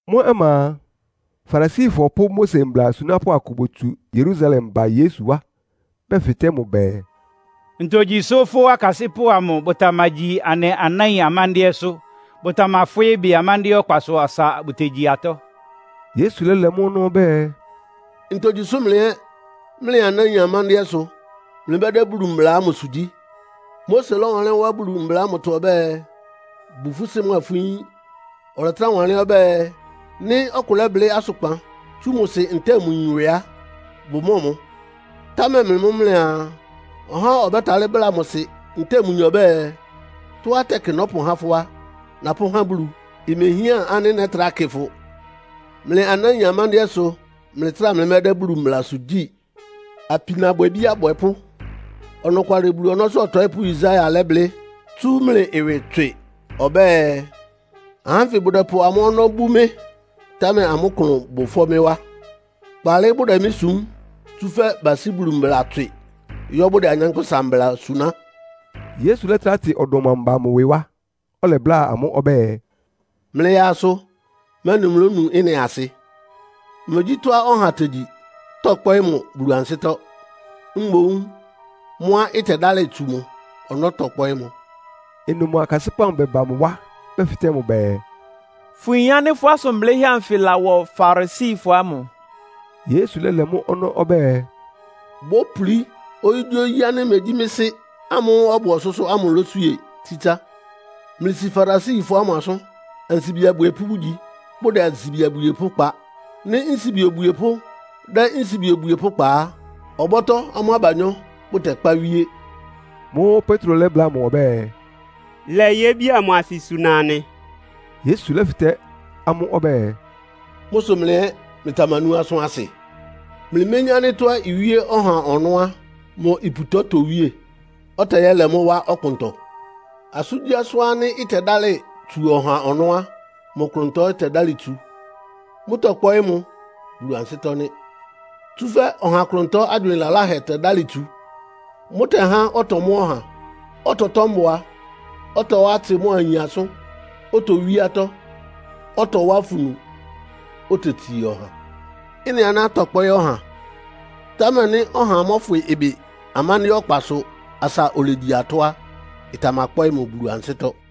Mʋ́ ɔma a, Farisifɔ pʋ́ Mose mbla asunápʋ́ akʋ botsu Yerusalem ba Yesu wá, bɛfɩtɛ́ mʋ bɛɛ, “Ntogyi sʋ́ fʋ́ akasɩ́pʋ́ amʋ bʋtamagyi anɩ anáin amándɩ́ɛ́sʋ́. Bʋtamafwɩ́ ɩbɩ amándɩ́ɛ́ ɔkpasʋ asa bʋtegyi atɔ́?” Yesu lɛ́lɛ mʋ́ ɔnɔ́ ɔbɛ́ɛ, “Ntogyi sʋ́ mlɩ ɛ́ mlɩ anáin amándɩ́ɛ́ sʋ mlɩmɛ́dɛ́ Bulu mbla ámʋsʋ gyí? Mose lɔ́wanlɩ́n wá Bulu mbla ámʋtɔ ɔbɛ́ɛ, ‘Bu fʋ́ sɩ́ mʋa fʋ́ yín,’ ɔlɛtrá wanlɩ́n ɔbɛ́ɛ, ‘Nɩ́ ɔkʋ lɛ́blɩ́ asʋkpan tsú mʋ sɩ ntɛ́ɛ mʋ yin ɩwɩ á, bʋmɔ́ɔ mʋ?’ Támɛ mlɩ mʋ́ mlɩaa, ɔha ɔbɛ́talɩ́ bláa mʋ sɩ ntɛ́ɛ mʋ yin ɔbɛ́ɛ, ‘Tɔ́á tɛkɩ nɔ́pʋhá fʋ́ á, napʋ́há Bulu. Imehián ánɩ́ nɛ́trá kɩ fʋ.’ Mlɩ anáin amándɩ́ɛ́ sʋ mlɩtráa mlɩmɛ́dɛ́ Bulu mblasʋ gyí. Apinabwɛbí abwɛpʋ́! Ɔnɔkwalɩ Bulu ɔnɔ́sʋ́ ɔtɔɩ́pʋ́ Yesaia lɛ́blɩ́ tsú mlɩ ɩwɩ tswɩ ɔbɛ́ɛ, ‘Ahá ánfɩ bʋdɛpʋ amʋ́ ɔnɔ́ bú mɩ́, támɛ amʋ́ klʋn bʋ ɩfɔ́ mɩ́ wá. Kpaalɩ bʋdɛ mɩ́ sum, tsúfɛ́ basí Bulu mbla tswɩ, yɔ́ bʋdɛ anyánkpʋ́sa mbla suná.’” Yesu lɛ́trá tɩ ɔdɔm amʋ ba mʋ ɩwɩ wá, ɔlɛbláa amʋ́ ɔbɛ́ɛ, “Mlɩyaa asʋ, mɛ́nɩ mlónu ɩ́nɩ asɩ. Megyí tɔ́á ɔha tegyi tɔ́kpɔ́ɩ́ mʋ Bulu ansɩ́tɔ́, mboún mʋ́á ɩtɛdálɩ tsu mʋ ɔnɔ́ tɔ́kpɔ́ɩ́ mʋ.” Ɩnʋ mʋ akasɩ́pʋ́ amʋ bɛba mʋ wá bɛfɩtɛ́ mʋ bɛɛ, “Fʋyin ánɩ́ fʋ́ asʋn blɩ́hɛ́ anfɩ lawɔ Farisifɔ ámʋ?” Yesu lɛ́lɛ mʋ́ ɔnɔ́ ɔbɛ́ɛ, “Bópulí oyígyíoyí ánɩ́ megyí mɩ́ Sɩ́ ámʋ́ʋ́ ɔbʋ ɔsʋ́sʋ́ ámʋ lóswíe tsitsá. Mlɩsi Farisifɔ ámʋ asʋ́n. Ansibi abwiepʋ́ bʋgyi, bʋdɛ ansibi abwiepʋ́ kpa. Nɩ́ nsibi obwiepʋ́ dɛ́ nsibi obwiepʋ́ kpa á, ɔbɔ́tɔ́ amʋ́ abanyɔ́ bʋtɛkpá wíé.” Mʋ́ʋ́ Petro lɛ́bláa mʋ ɔbɛ́ɛ, “Lɛ yébi amʋ asɩ suna anɩ.” Yesu lɛ́fɩtɛ́ amʋ́ ɔbɛ́ɛ, “Mʋ́ sʋ mlɩ ɛ́ mlɩtamanú asʋ́n asɩ? Mlɩméyín ánɩ́ tɔ́á iwíé ɔha ɔnɔ́ á, mʋ iputɔ itowíé, ɔtɛyɛ́lɛ mʋ́ wá ɔkpʋntɔ? Asʋ́ngyíasʋ́n ánɩ́ ɩtɛdálɩ tsu ɔha ɔnɔ́ á, mʋ klʋntɔ ɩ́tɛdálɩ tsu. Mʋ́tɔkpɔ́ɩ́ mʋ Bulu ansɩ́tɔ́ nɩ́. Tsúfɛ́ ɔha klʋntɔ ágywɩɩn laláhɛ tɛdálɩ tsu. Mʋ́tɛ́há ɔtɔmɔ́ ɔha, ɔtɔtɔ́ mbʋa, ɔtɔwá atsɩ mʋ́a ayin asʋ́n, otowí atɔ́, ɔtɔwá afunu, otetsii ɔha. Ɩ́nɩ aná tɔ́kpɔ́ɩ́ ɔha, támɛ nɩ́ ɔha mɔ́fwɩ ɩbɩ amándɩ́ɛ́ ɔkpasʋ asa olegyi atɔ́ á, ɩtamakpɔ́ɩ́ mʋ Bulu ansɩ́tɔ́.”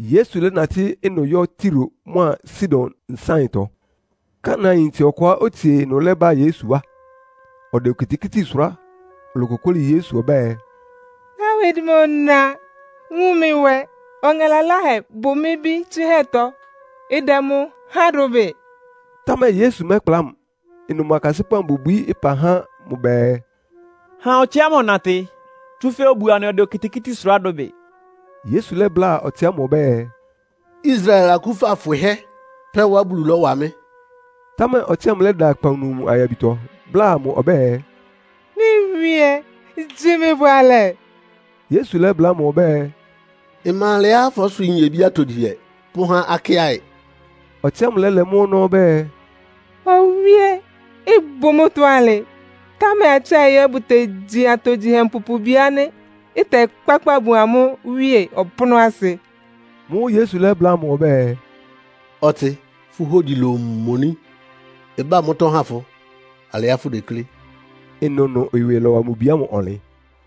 Yesu lɛ́natɩ́ ɩnʋ yɔ́ Tiro mʋ́a Sidon nsáɩntɔ. Kanaanyintse ɔkʋá otsie ɩnʋ lɛ́ba Yesu wá. Ɔdɛ okitikíti sʋrá, olokokóli Yesu ɔbɛ́ɛ, “Dawid mʋ na, wun mɩ nwɛ! Ɔŋɛ laláhɛ bʋ mɩ́ bí tsɩ́hɛ́tɔ́. Ɩdɛ mʋ háan dʋbɩ.” Támɛ Yesu mɛ́kpla mʋ. Ɩnʋ mʋ akasɩ́pʋ́ amʋ bobwií ɩpa há mʋ bɛɛ “Ha ɔtsɩ ámʋ ɔnatɩ, tsúfɛ́ obuo anɩ ɔdɛ okitikíti sʋrá dʋbɩ.” Yesu lɛ́bláa ɔtsɩ ámʋ ɔbɛ́ɛ, “Israel akúfa fwɩhɛ́ pɛ́ wá Bulu lɔ́wa mɩ́.” Támɛ ɔtsɩ ámʋ lɛ́da akpawunu mʋ ayabitɔ, bláa mʋ ɔbɛ́ɛ, “Mɩ́ Wíé, gyi mɩ bʋalɛ.” Yesu lɛ́bláa mʋ ɔbɛ́ɛ, “Ɩma alɛá fɔ́swɩɩ́ nyebí atogyihɛ pʋ́há akɩ́aɩ.” Ɔtsɩ ámʋ lɛ́lɛ mʋ́ ɔnɔ́ ɔbɛ́ɛ, “Owíé, ɩbʋ mʋ́tɔ́ alɩ, támɛ akɩ́aɩ ɛ́ bʋtegyi atogyihɛ mpupubi ánɩ́ ɩtɛkpákpa bun amʋ́ wíe ɔpʋ́nʋ́asɩ.” Mʋ́ʋ́ Yesu lɛ́bláa mʋ ɔbɛ́ɛ, “Ɔtsɩ, fʋ́ hógyi lomoní. Ɩbá mʋ́tɔ́ ha fʋ alɩá fʋdeklé.” Ɩnʋnʋ ɩwɩ lɔ́wa mʋ bi ámʋ ɔnlɩn.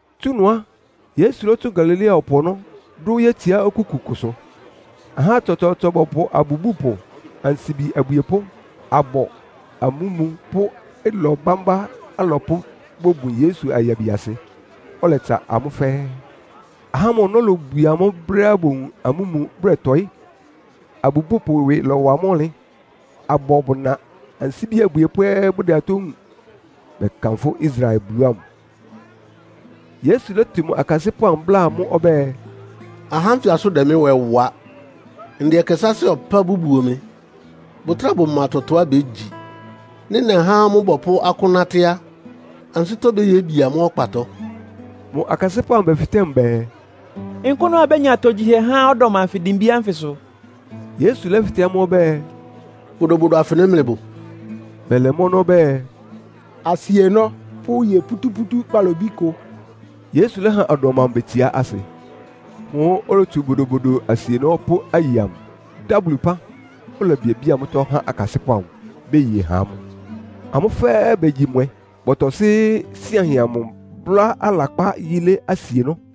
Tsú ɩnʋ á, Yesu lɔ́tsʋn Galilea ɔpʋ ɔnɔ́, dʋ́ yétsiá okúku kʋsʋ. Ahá tsɔtsɔɔtsɔ bɔpʋ abubúpʋ, ansibi abwiepʋ́, abɔ, amúmu pʋ́ ɩlɔ bámbá alɔpʋ́ bobun Yesu ayabiasɩ, ɔlɛtsa amʋ́ fɛ́ɛ́. Ahá ámʋ ɔnɔ́ lobwie amʋ́ brɛ́á bowun amúmu bʋdɛtɔɩ́, abubúpʋ ɩwɩ lawá amʋ́ ɔnlɩn, abɔ bʋna, ansibi abwiepʋ́ ɛ́ bʋdɛ atɔ́ wúun, bɛkanfʋ́ Israel Bulu ámʋ. Yesu lɛ́tɩ mʋ akasɩ́pʋ́, bláa amʋ́ ɔbɛ́ɛ, “Ahá ánfɩ asʋ́n dɛ mɩ́ nwɛ wa. Ndɛ ɛkɛ sáásɩ́ ɔpá bʋbuo mɩ, bʋtráa bʋma tɔtɔá bégyi. Nɩ́ nɛhá amʋ́ bɔpʋ́ akʋ́n nátɩ́ á, ansɩ́tɔ́ béyebi amʋ́ ɔkpatɔ.” Mʋ akasɩ́pʋ́ amʋ bɛfɩtɛ́ mʋ bɛɛ, “Nkʋ́nʋ́ abénya atogyihɛ há ɔdɔm anfɩ dimbí ánfɩsʋ?” Yesu lɛ́fɩtɛ́ amʋ́ ɔbɛ́ɛ, “Bodobodo afɩnɩ mlɩbʋ?” Bɛlɛ mʋ́ ɔnɔ́ bɛɛ, “Asienɔ́ pʋ́ aye pútúpútú kpalobí kʋ.” Yesu lɛ́ha ɔdɔm amʋ betsiá asɩ. Mʋ́ʋ́ olotsu bodobodo asienɔ́ pʋ́ aye amʋ, dá Bulu ɩpán, olebiabía mʋ́tɔ́ há akasɩ́pʋ́ amʋ, beye ha amʋ́. Amʋ́ fɛ́ɛ́ begyi mwɛ. Bɔtɔsɩ́ síanhɛ amʋ bʋ́lá alakpá yílé asienɔ́.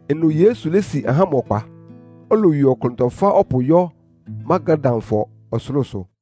Ɩnʋ Yesu lési ahá ámʋ ɔkpa, olowie ɔklʋntɔ fá ɔpʋ yɔ́ Magadanfɔ ɔsʋlʋ́sʋ.